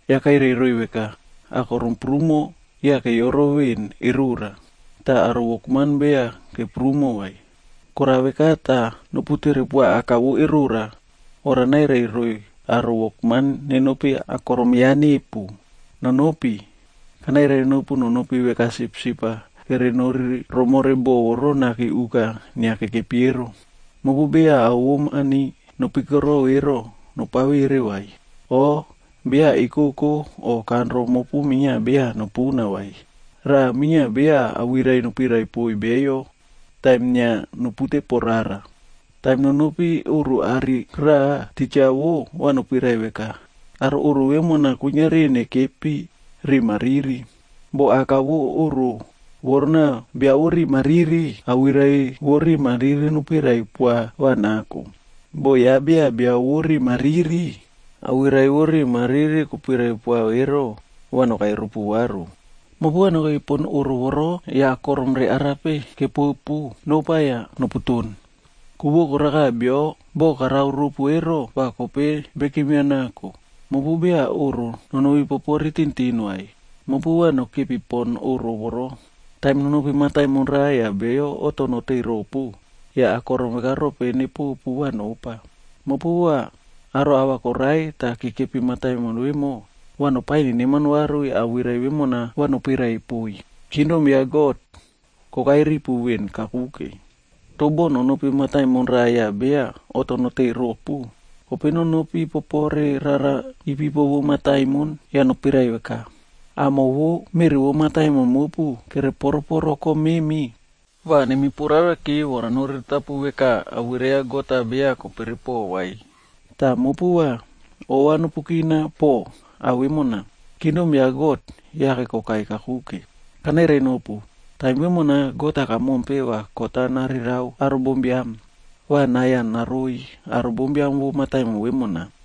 Yah kairai roiy veka, “Akorom prumo yah kere yoro veꞌen erora, toh aro wokman beya keprumo vai. Korao veka, tah nopu tere poa Aka vo erora vora nairai roiy aro wokman nenopi akorom ya nepu. Nonopi! Kanairai nopu nonopi veka sipsip-aa kerenori romore bo voro naki uka inia kekepi ero. Mopu beya ao vo mani nopikoro ero, nopavere vai, o beya ekoko o kanro mopu minia beya nopuna vai. Raꞌa minia beya awirai nopirai poiy beyo taim inia nopute po rara. “Taim nonopi oꞌro are raꞌa, titja wo, va nopirai veka, ‘Aro oꞌro vemona kuiniari nokepi riꞌi mariri.’ Boh aka vo oꞌro vorona bia vo riꞌi mariri, awirai vo riꞌi mariri nopirai poa va nako. Boh ya beya bio vo riꞌi mariri, awirai vo riꞌi mariri kopirai poa ero, va nokai ropu varu. Mopu va nokepi pon oꞌro voro yah akorom re arape kepopu, nopa yah noputon. Ku vo koraka bio boꞌo karao ropu ero, va kope bekim ya nako. Mopu beya oꞌro nonopi popore tintin vai, mopu va nokepi pon oꞌro voro. “Taim nonopi mataimon raꞌa yah beyo oꞌto noteiy ropu, yah akorom veka rope nepopu va nopa. Mopu va aro ahva koraiy tah kekepi mataimon vemo, va nopaiy neneman varu yah awirai vemona va nopirai poiy, ‘Kingdom ya God kokai ripu veꞌen kakuke.’ Toh boh, nonopi mataimon raꞌa yah beya oꞌto noteiy ropu, kope nonopi popore rara ipipo vo mataimon yah nopirai veka, ‘Amo vo meꞌri vo mataimon mopu kere poro poro kom memi, va nemi puraraki vora noriritapu veka awirai ya God-a beya kopere poꞌo vai. Tah mopu va ova nopukina po ao vemona, Kingdom ya God yake kokai kakuke. Kanairai nopu, taim vemona God-a kamompe va kot-a narerao aro bombiam, va nai-a naroi aro bombiam vo mataimon vemona,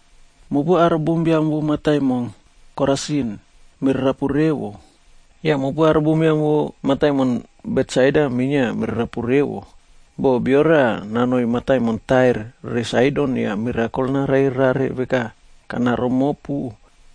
“Mopu aro bombiam vo mataimon Korasin, mererapu revo! Yah mopu aro bombiam vo mataimon Betsaida minia mererapu revo! Boh, bia raꞌa nanoi mataimon Tair re Saidonc yah mirakol narare rare veka kanao romopu,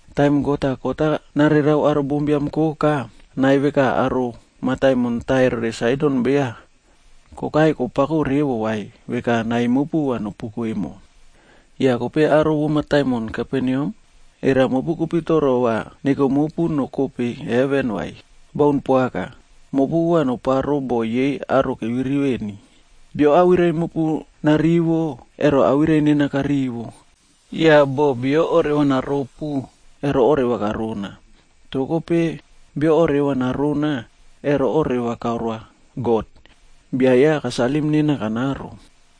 Taim God-a kot-a narerao aro bombiam koka, nai veka aro mataimon Tair re Saidon beya kokai kopako revo vai veka nai mopu va nopuko emo. Yah mopu aro vo mataimon Kaperneam, era mopu kopitoro va neko mopu nokope heven, vai? Baun poaka! Mopu va noparo boꞌo yei aro keviri veni. “Bio awirai mopu narivo, ero awirai nena karivo, yah boh bio oreva naropu, ero oreva karona. Toh kope, bio oreva narona, ero oreva karoa God, bia ya kasalim nena kanaro.”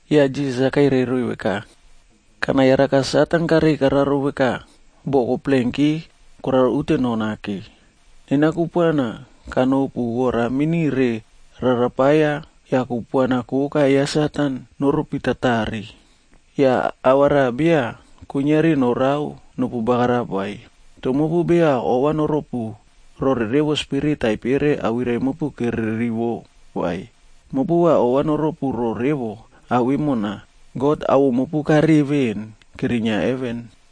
Yah Jisas kairai roiy veka, “Kana yaraka Satan karei kararo veka bo koplenki koraro unteno nake. Nena kupuana kanopu vora mini re rarapaia yah kupuana koka ya Satan noropi tatare. Yah ava raꞌa beya kuiniari norao nopu bagarap vai. Toh mopu beya ova noropu rore revo spirit taipere awirai mopu kere rivo vai, mopu va ova noropu roꞌo revo ao vemona, God awoꞌo mopu kareꞌe ven kerinia heven.”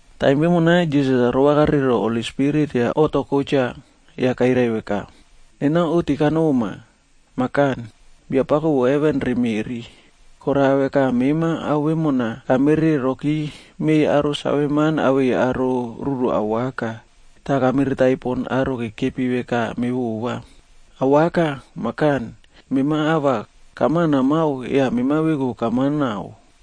Taim vemona, Jisas-a rova kare roꞌo Holi Spirit yah oꞌto kotcha yah kairai veka, “Nena oꞌti kanoma, Mah Kan, Biapako vo heven re meꞌri. Korao veka mema ao vemona kamere roki meiy aro saveman awei aro ruru awaka, tah kamiritai pon aro kekepi veka mevova. Awaka, Mah Kan, mema ava kama namao yah mema veku kamao nao.”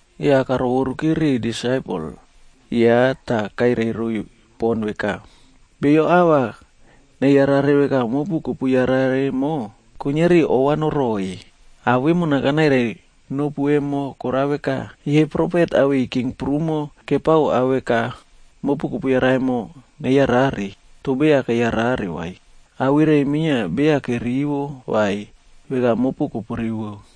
Yah karovoruki riꞌiy disaipel ya tah kairai roiy pon veka, “Beyo ava neyara veka mopu kopu yara emo, kuiniari ova noroiy. Ao vemona kanairai nopu emo korao veka, yei profet awei king prumo kepao ao veka mopu kopu yara emo, neyarare, toh beya keyarare vai. Awirai minia beya kerivo vai, veka mopu kopurivo.”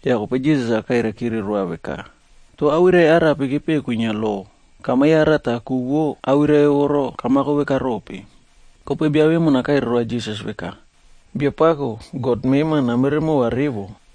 Yah kope Jisas kairai kire roa veka, “Toh awirai arape kepeꞌe kwinia lo? Kama yara tah ku vo awirai voro kamako vekarope?” Kope bia vemona kairai roa Jisas veka, ‘Biapako, God mema, namere mova revo,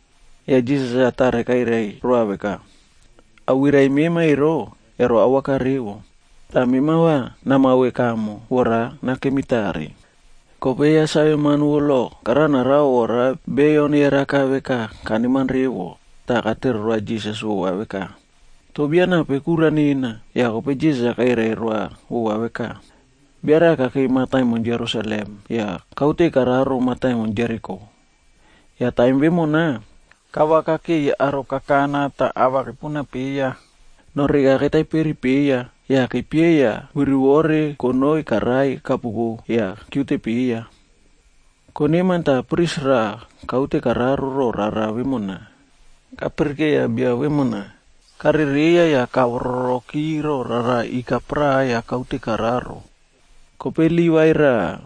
Yah Jisas tare kairai roa veka, “Awirai mema ero, ero awaka revo. Tah mema va namao veka emo, vora nakemi tare.” Kope ya saveman vo lo kara narao vora beyo neyaraka veka kaneman revo tah katere roa Jisas vova veka, “Toh bia nape kura nena?” Yah kope Jisas-a kairai roa vova veka, “Bia raꞌa kakei mataimon Jerusalem yah kaute kararo mataimon Jeriko. Yah taim vemona, kavakakeiy aro kakana tah ava kepuna peiya, noreka ketaiperi peiya, yah kepieiya virivore konoi karai kapuko yah kiute peiya. Koneman tah pris raꞌa kaute kararo ro rara vemona. Kapiri keiya bia vemona, karereiya yah kavororoki roꞌo rara ika paraꞌa yah kaute kararo. “Kope Livaig raꞌa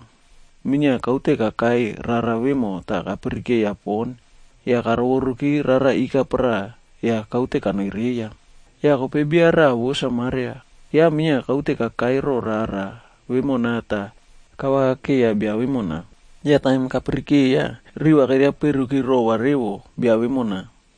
minia kaute kakai rara vemo tah kapirikeiya pon yah kavororoki rara ika paraꞌa yah kaute kanoi reiya. Yah kope bia raꞌa vo Samariah ya minia kaute kakai roꞌo rara vemona tah kavaka keiya bia vemona. Yah taim kapirikeiya, riva keriaperuki rova revo bia vemona.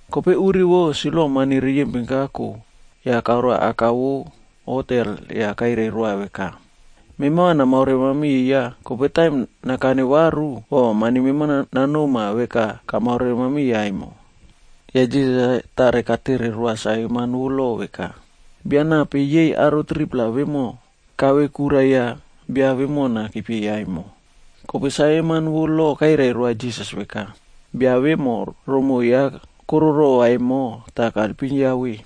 Kope uri vo, silva mani riyempin kako yah karoa aka vo hotel yah kairai roa veka, ‘Mema va namaore mamiya, kope taim nakane varu, va mani mema nanoma veka kamaore mamiya emo.’” Yah Jisas-a tare katere roa saveman vo lo veka, “Bia nape yei aro 3-pla vemo kave kura ya bia vemona kepieiya emo?” Kope saveman vo lo kairai roa Jisas veka, “Bia vemo romoꞌo ya koro rova emo tah kaelpim ya ve.”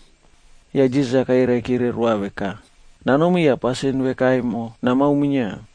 Yah Jisas kairai kire roa veka, “Nanomi yah pasin veka emo namao minia.”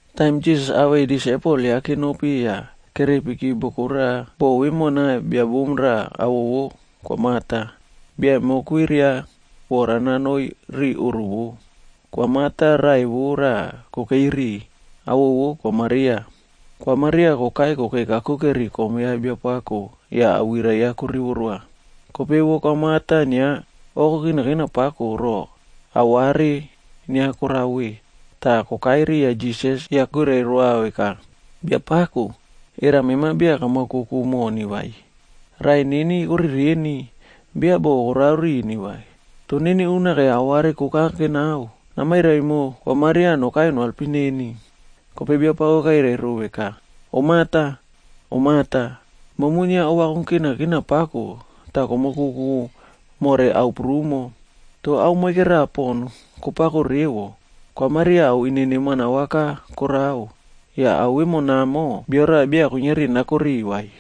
Taim Jisas awei disaipel ya kenopi yah kerepiki boko raꞌa. Boko vemona bia bom raꞌa awoꞌo vo Kwa Marta, bia emo kwiria vora nanoi ri oꞌro vou. Kwa Marta raꞌai vou raꞌa kokei ri, awoꞌo vo Kwa Maria. Kwa Maria kokai kokei kakuke ri kom ya Biapako yah awirai ya korivo roa. Kope vo Kwa Marta inia kokinakina pako ro aware inia korao ve, tah kokai riya Jisas yah kwirai roa veka, “Biapako, era mema beya kamaokoku moni vai? Raꞌai neni korereni, beya boꞌo korao rini vai. Tah neni unake aware koka kenao, namairai mo Kwa Maria nokai noalpim neni.” Kope Biapako kairai ro veka, “Om Marta, Om Marta, momu inia ova kokinakina pako tah komokouku more ao prumo. Toh ao moike raꞌa pon kopako revo. Kwa Maria ao ine neman awaka korao, yah ao vemonamo bio raꞌa beya kuiniari nako ri vai.”